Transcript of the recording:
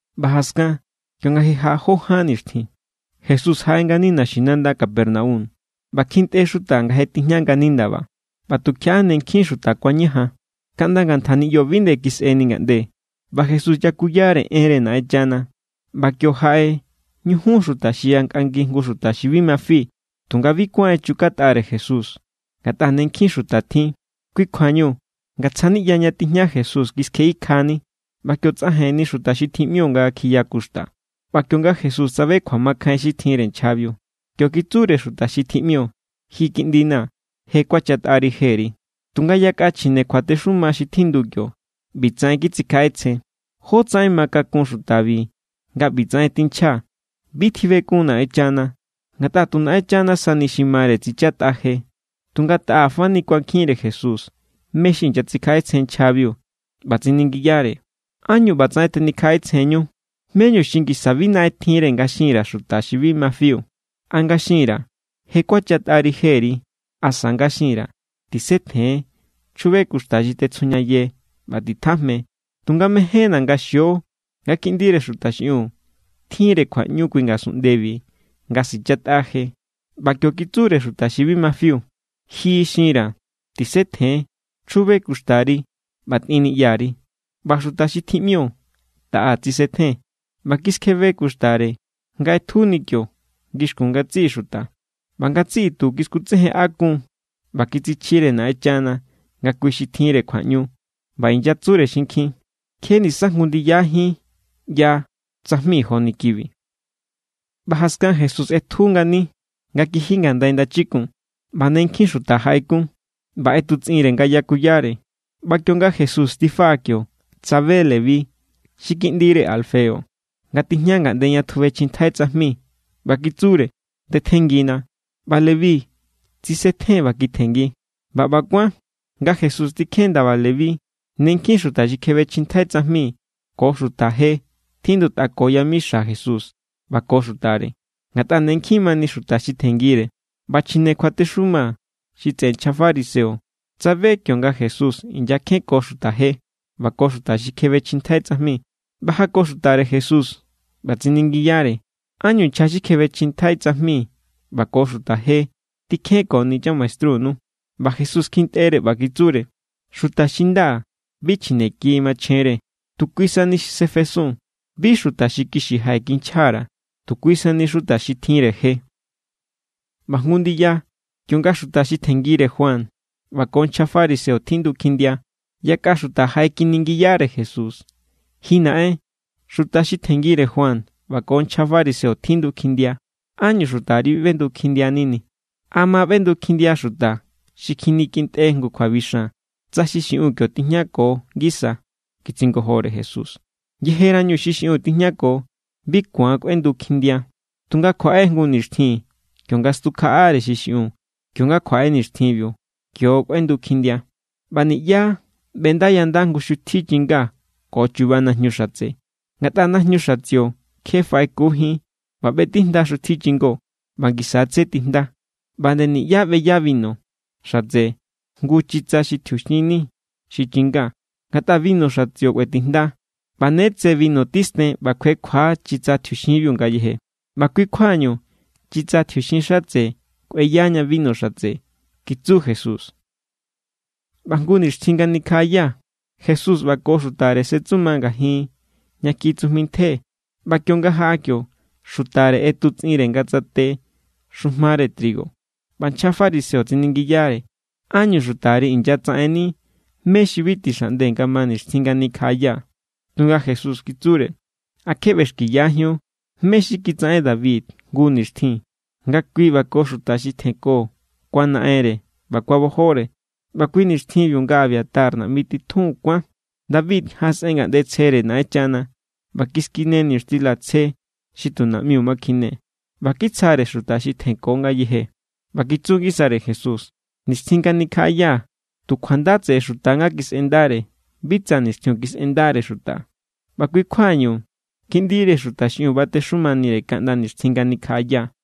ꞌBa jaskan, kionga je jaꞌa jó ján nixtjin, Jesús jaꞌe ngani naxinanda Capernaum; ꞌba kjintꞌe xuta nga je tijña ngani ndaba. ꞌBa tukjiaꞌa ne nkjin xuta kuañajan, kaꞌnda ngantja niꞌyo bi nde kisꞌeni ngaꞌnde; ꞌba Jesús yakuyare enre Naꞌenchana. ꞌBa kio, jaꞌe ñujun xuta xi yankꞌangi jngu xuta xi bi ma fi. Tunga bi kuán echukatꞌare Jesús, ngatꞌa ne nkjin xuta tjin. Kui kjuañu ngatsja niꞌya ña tijña Jesús kiskjeꞌikjani, ꞌba kio tsꞌajenni xuta xi tjiꞌmio nga kjiya kuxta. ꞌBa kionga Jesús tsabe kjuamakjain xi tjinre nchjabiu, kio kitsure xuta xi tjiꞌmio: —Ji kiꞌndina̱, je kuachatꞌari jeri. Tunga yakꞌa chjine kjuatexuma xi tjindu kio, ꞌbitsaꞌen kitsikjaꞌetsjen: “¿Jótsaꞌen ma kakun xutabi nga ꞌbitsaꞌen tinchja? Bi tjibekun Naꞌenchana, ngatꞌa tu Naꞌenchana sani xi mare tsichatꞌa je.” Tunga taꞌa fani kuankjinre Jesús mé xi inyatsikjaꞌetsjen nchjabiu, ꞌba tsiningiyare: —¿Ánñu ꞌbatsaꞌen tenikjaꞌetsjenñu? ¿Méñu xi ngisa bi naꞌenre nga xin_ra̱ xuta xi bi ma fiu? ¿A nga xin_ra̱: “Je kuachatꞌari jeri”, asa nga xin_ra̱: “Tisetjen, chjube kuxta xi tetsjujñaye ꞌba titjajme”? Tunga mejénna̱ nga xio nga Kiꞌndire Xuta xiꞌiun tjinre kjuaꞌñu kui ngasunꞌndebi nga sichatꞌa je. ꞌBa kio kitsure xuta xi bi ma fiu: —Ji xinra̱, tisetjen, chjube kuxtari ꞌba tꞌin niꞌyari. ꞌBa xuta xi tjiꞌmio taꞌa tsisetjen, ꞌba kiskjebe kuxtare nga ꞌetjuni kio ngixkun ngatsiꞌi xuta. ꞌBa ngatsiꞌi tu kiskutsejenꞌakun= ꞌba kitsichjire Naꞌenchana nga kui xi tjinre kjuaꞌñu. ꞌBa inyatsure xinkjin: —Kje nisa jngu ndiyajín ꞌya tsajmi joni kibi. ꞌBa jaskan Jesús ꞌetju ngani nga kiji ngandai ndachikun; ꞌba ne nkjin xuta jaꞌekun, ꞌba ꞌetutsꞌinre nga yakuyare. ꞌBa kionga Jesús tifaꞌa kio, tsabe Leví xi kiꞌndire Alfeo, nga tijña ngaꞌnde ña tjubechjintjai tsajmi, ꞌba kitsure: —Ndetjenngina. ꞌBa Leví tsisetjen ꞌba kitjenngi. ꞌBa ꞌba kuán nga Jesús tikjen ndaba Leví, ne nkjin xuta xi kjebechjintjai tsajmi ko xuta je tjindutꞌako yamixa Jesús ꞌba ko xutare; ngatꞌa ne nkjin mani xuta xi tjenngire. ꞌBa chjine kjuatexuma xi tseꞌe nchja fariseo tsabe kionga Jesús inyakjenko xuta je ꞌba ko xuta xi kjebechjintjai tsajmi. ꞌBa jako xutare Jesús, ꞌba tsiningiyare: —¿Ánñu nchja xi kjebechjintjai tsajmi ꞌba ko xuta je tikjenkoni chamaestrunu? ꞌBa Jesús kjintꞌere, ꞌba kitsure: —Xuta xi nda bi chjine ki machjenre, tu kui sani xi sefesun. Bi xuta xi kixi jaꞌekinchja_ra̱, tu kui sani xuta xi tjinre je. ꞌBa jngu ndiya, kionga xuta xi tjenngire Juan ꞌba ko nchja fariseo tjindu kjindia, yakꞌa xuta jaꞌekjeningiyare Jesús: —Ji naꞌen, xuta xi tjenngire Juan ꞌba ko nchja fariseo tjindu kjindia. ¿Ánñu xutari bi ꞌbendu kjindianini? —¿A ma ꞌbendu kjindia xuta xi kjinikjintꞌe jngu kjuabixan, tsa xi xiꞌun kio tijñako ngisa? —kitsingojore Jesús—. Yejerañu xi xiꞌun tijñako, bi ku̱an kꞌuendu kjindia. Tunga kjuaꞌe jngu nixtjin kionga stukjaꞌare xiꞌun; kionga kjuaꞌe nixtjinbiu kio= kꞌuendu kjindia. ’ꞌBa niꞌyá ꞌbendayanda jngu xutji chinga ko chuba najñu xatse; ngatꞌa najñu xatsio kje faꞌekujín ꞌba ꞌbetijnda xutji chingó, ꞌba ngisa= tse tijnda. ꞌBa nde niꞌyá ꞌbeya binu xatse jngu chitsa xi tjiuxin ni xi chinga; ngatꞌa binu xatsio kꞌuetijnda, ꞌba ne tse binu tisten ꞌba kjuekjua= chitsa tjiuxinbiu ngayeje. ꞌBa kui= kjuañu chitsa tjiuxin xatse kꞌueyaña binu xatse —kitsu Jesús. ꞌBa jngu nixtjin nga nikjaꞌaya Jesús ꞌba ko xutare setsuma ngajin ña kjiꞌi tsujmi ntje. ꞌBa kionga jaꞌa kio, xutare ꞌetutsꞌinre nga tsate xujmare trigo. ꞌBa nchja fariseo tsiningiyare: —¿Ánñu xutari inyatsaꞌenni mé xi bi tixaꞌnde nga ma nixtjin nga nikjaꞌaya? Tunga Jesús kitsure: —¿A kje ꞌbexkiyajíun mé= xi kitsaꞌen David jngu nixtjin nga kui ꞌba ko xuta xi tjenko kuanaꞌenre ꞌba kuabojore? ꞌBa kui nixtjinbiu nga Abiatar naꞌmi titjun kuán, David jaꞌasꞌen ngaꞌnde tsjere Naꞌenchana, ꞌba kiskine niñuxtila tsje, xi tu naꞌmiu ma kjine; ꞌba kitsjare xuta xi tjenko ngayeje. ꞌBa kitsu ngisare Jesús: —Nixtjin nga nikjaꞌaya tu kjuanda tseꞌe= xuta nga kisꞌendare, bi tsa nixtjiun kisꞌendare xuta. ꞌBa kui= kjuañu Kiꞌndire Xuta xiꞌiun batexumanire kaꞌnda nixtjin nga nikjaꞌaya.